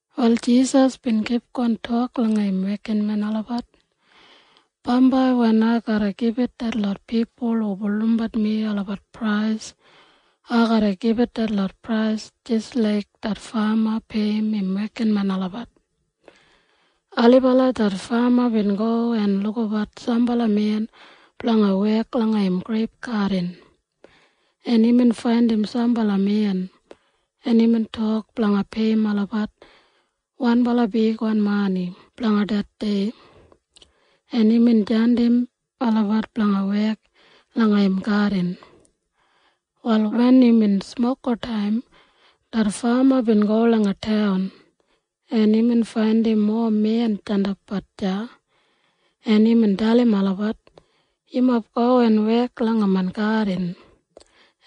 Wal Jisas bin kipgon tok langa im wekinmen olabat, “Bambai wen ai garra gibit detlot pipul hu bulurrum mi olabat prais, ai garra gibit detlot prais jis laik det fama peiyim im wekinmen olabat. Ailibala det fama bin go en lukabat sambala men blanga wek langa im greip gadin. En imbin faindim sambala men, en imbin tok blanga peiyim olabat wanbala bigwan mani blanga det dei, en imbin jandim olabat blanga wek langa im gadin. “Wal wen imbin smokotaim, det fama bin go langa taun, en imbin faindim mowa men jandapbat deya, en imbin dalim olabat, ‘Yumob go en wek langa main gadin,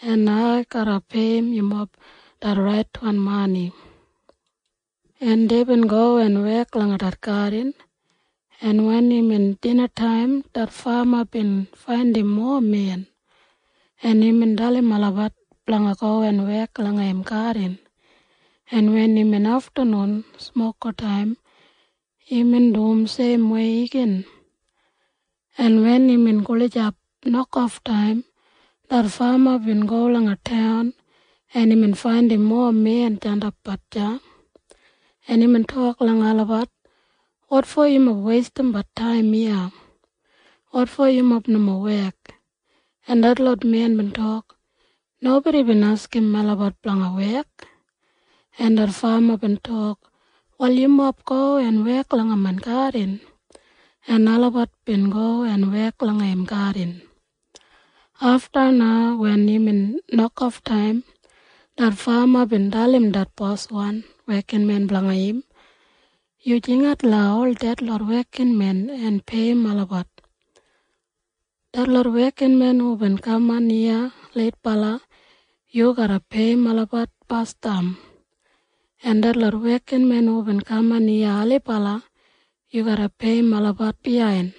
en ai garra peiyim yumob det raitwan mani.’ En deibin go en wek langa det gadin. En wen imbin dinataim, det fama bin faindim mowa men, en imbin dalim olabat blanga go en wek langa im gadin. En wen imbin aftanun smokotaim imbin dum seimwei igin. En wen imbin gulijap nokoftaim, det fama bin go langa taun, en imbin faindim mowa men jandapbat deya, en imbin tok langa olabat, ‘Wotfo yumob weistimbat taim iya? Wotfo yumob nomo wek?’ En detlot men bin tok, ‘Nobodi bin askim melabat blanga wek.’ En det fama bin tok, ‘Wal yumob go en wek langa main gadin.’ En olabat bin go en wek langa im gadin. “Afta na wen imbin nokoftaim, det fama bin dalim det boswan wekinmen blanga im, ‘Yu jingat langa ol detlot wekinmen en peiyim olabat. Detlot wekinmen hubin kaman iya leitbala, yu garra peiyim olabat basdam, en detlot wekinmen hubin kaman iya ailibala, yu garra peiyim olabat biyain.’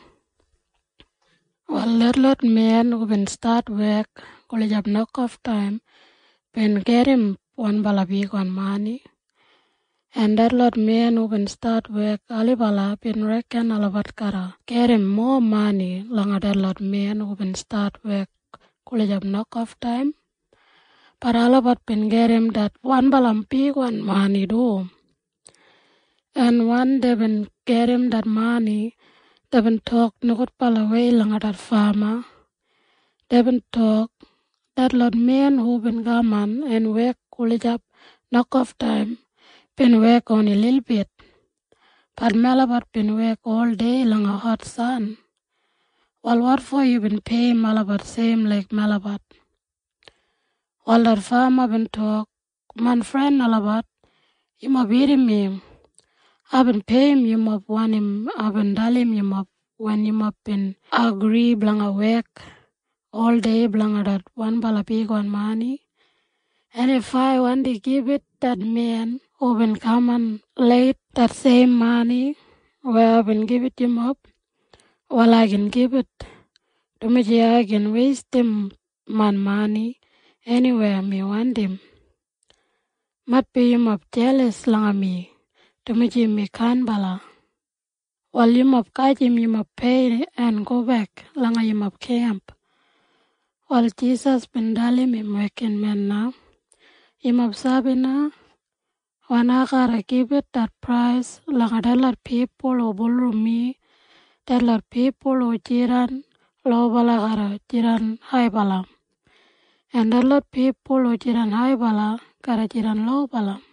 “Wal detlot men hubin stat wek gulijap nokoftaim bin gedim wanbala bigwan mani, en detlot men hubin stat wek ailibala bin reken olabat garra gedim mowa mani langa detlot men hubin stat wek gulijap nokoftaim. Bat olabat bin gedim det wanbala bigwan mani du. En wen deibin gedim det mani, deibin tok nogudbalawei langa det fama. Deibin tok, ‘Detlot men hubin kaman en wek gulijap nokoftaim bin wek oni lilbit. Bat melabat bin wek oldei langa hot san. Wal wotfo yubin peiyim olabat seim laik melabat?’ “Wal det fama bin tok, ‘Main fren olabat, yumob irrim mi. Aibin peiyim yumob wanim aibin dalim yumob wen yumob bin agri blanga wek oldei blanga det wanbala bigwan mani. En if ai wandi gibit det men hubin kaman leit det seim mani weya aibin gibit yumob, wal ai gin gibit, dumaji ai gin weistim main mani eniwei mi wandim. Maitbi yumob jelas langa mi, dumaji mi kainbala. Wal yumob gajim yumob pei en gobek langa yumob kemp.’” Wal Jisas bin dalim im wekinmen na, “Yumob sabi na? Wen ai garra gibit det prais langa detlot pipul hu bulurrum mi, detlot pipul hu jidan lobala garra jidan haibala, en detlot pipul hu jidan haibala garra jidan lobala.”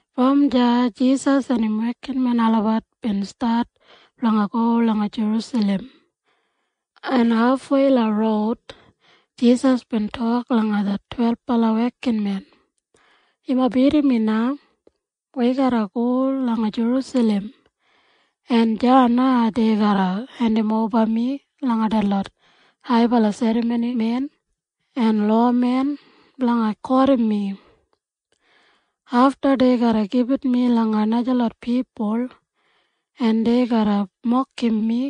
Brom deya Jisas en im wekinmen olabat bin stat blanga go langa Jerusalem, en hafwei langa roud Jisas bin tok langa det twelbala wekinmen, “Yumob irrim mi na. Wi garra go langa Jerusalem, en deya na dei garra hendimoba mi langa detlot haibala serramonimen en lowamen blanga kotim mi. Afta dei garra gibit mi langa najalot pipul, en dei garra mokim mi,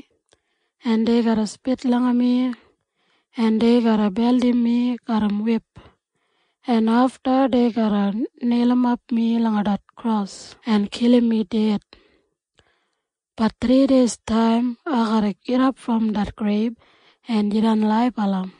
en dei garra spit langa mi, en dei garra beldim mi garram wip, en afta dei garra neilimap mi langa kros en kilim mi ded. Bat thrideistaim ai garra gidap brom det greib en jidan laibala.”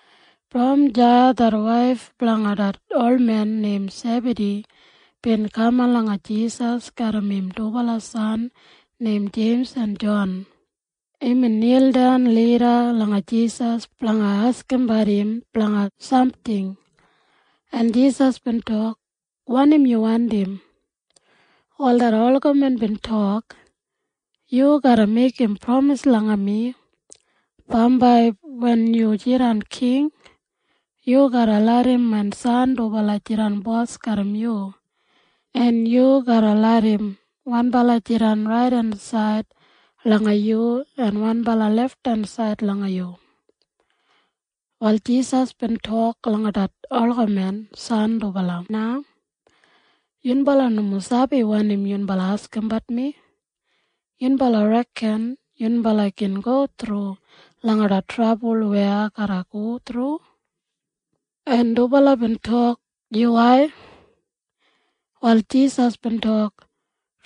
Brom deya det waif blanga det olmen neim Sebadi bin kaman langa Jisas garram im dubala san neim Jeims en Jon. Imbin nildan lida langa Jisas blanga askimbat im blanga samting, en Jisas bin tok, “Wanim yu wandim?” Wal det olgamen bin tok, “Yu garra meigim pramis langa mi. Bambai wen yu jidan king, yu garra larram main san dubala jidan bos garram yu, en yu garra larram wanbala jidan raidensaid langa yu en wanbala lefthensaid langa yu.” Wal Jisas bin tok langa det olgamen san dubala na, “Yunbala nomo sabi wanim yunbala askimbat mi. Yunbala reken yunbala gin go thru langa det trabul weya ai garra go thru?” En dubala bin tok, “Yuwai.” Wal Jisas bin tok,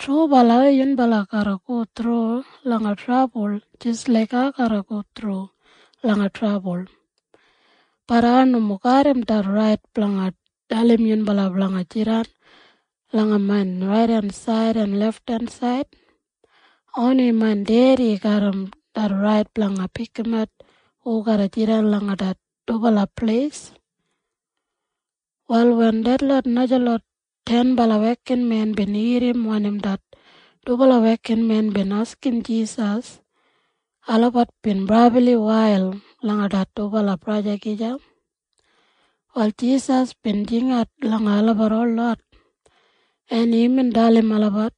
“Trubala yunbala garra go thru langa trabul jis laik ai garra go thru langa trabul. Bat ai nomo garram det rait blanga dalim yunbala blanga jidan langa main raidensaid en lefthensaid. Oni main Dedi garram det rait blanga pikimat hu garra jidan langa det dubala pleis.” Wal wen detlot najalot tenbala wekinmen bin irrim wanim det dubala wekinmen bin askim Jisas, olabat bin brabli wail langa det dubala braja gija. Wal Jisas bin jingat langa olabat holot, en imbin dalim olabat,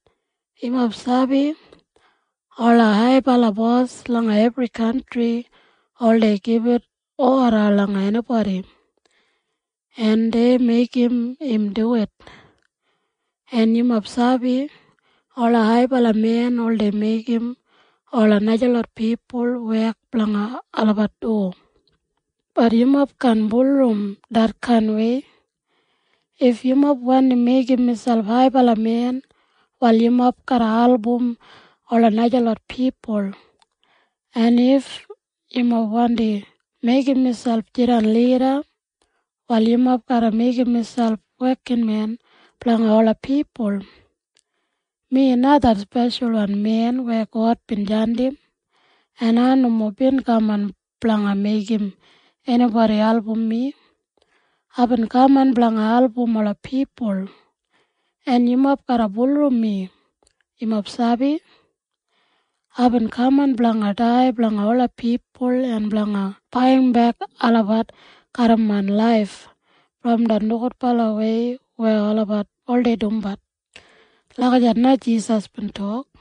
“Yumob sabi ola haibala bos langa ebri kantri oldei gibit oda langa enibodi, en dei meigim im duwit. En yumob sabi ola haibala men oldei meigim ola najalot pipul wek blanga olabat du. Bat yumob kaan bulurrum detkainwei. If yumob wandi meigim miselp haibala men, wal yumob garra album ola najalot pipul. En if yumob wandi meigim miselp jidan lida, wal yumob garra meigim miselp wekinmen blanga ola pipul. Mi na det Speshalwan Men weya God bin jandim, en ai nomo bin kaman blanga meigim enibodi album mi. Aibin kaman blanga album ola pipul. En yumob garra bulurrum mi. Yumob sabi? Aibin kaman blanga dai blanga ola pipul en blanga baiyimbek olabat garram main laif brom det nogudbalawei weya olabat oldei dumbat.” Lagijat na Jisas bin tok.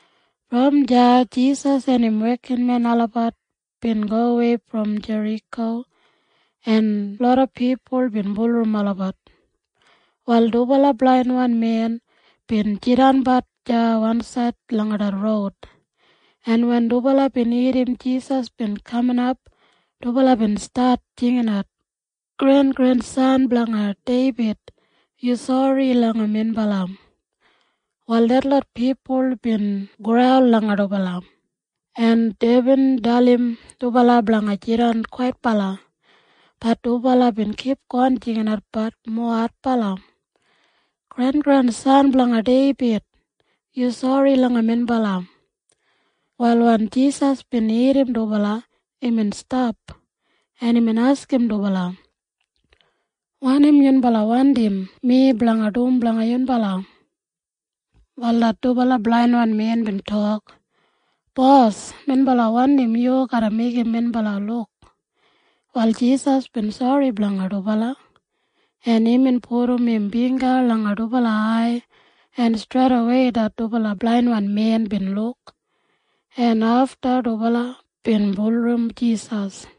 Brom deya Jisas en im wekinmen olabat bin gowei brom Jeriko, en loda pipul bin bulurrum olabat. Wal dubala blainwan men bin jidanbat deya wansaid langa det roud, en wen dubala bin irrim Jisas bin kaminap, dubala bin stat jinginat, “Grengrensan blanga Deibid! Yu sori langa minbala!” Wal detlot pipul bin graul langa dubala, en deibin dalim dubala blanga jidan kwaitbala. Bat dubala bin kipgon jinginatbat mowa adbala, “Grengrensan blanga Deibid! Yu sori langa minbala!” Wal wen Jisas bin irrim dubala, imbin stap, en imbin askim dubala, “Wanim yunbala wandim mi blanga dum blanga yunbala?” Wal det dubala blainwan men bin tok, “Bos, minbala wandim yu garra meigim minbala luk.” Wal Jisas bin sori langa dubala, en imbin pudum im bingga langa dubala ai, en streidawei det dubala blainwan men bin luk, en afta dubala bin bulurrum Jisas.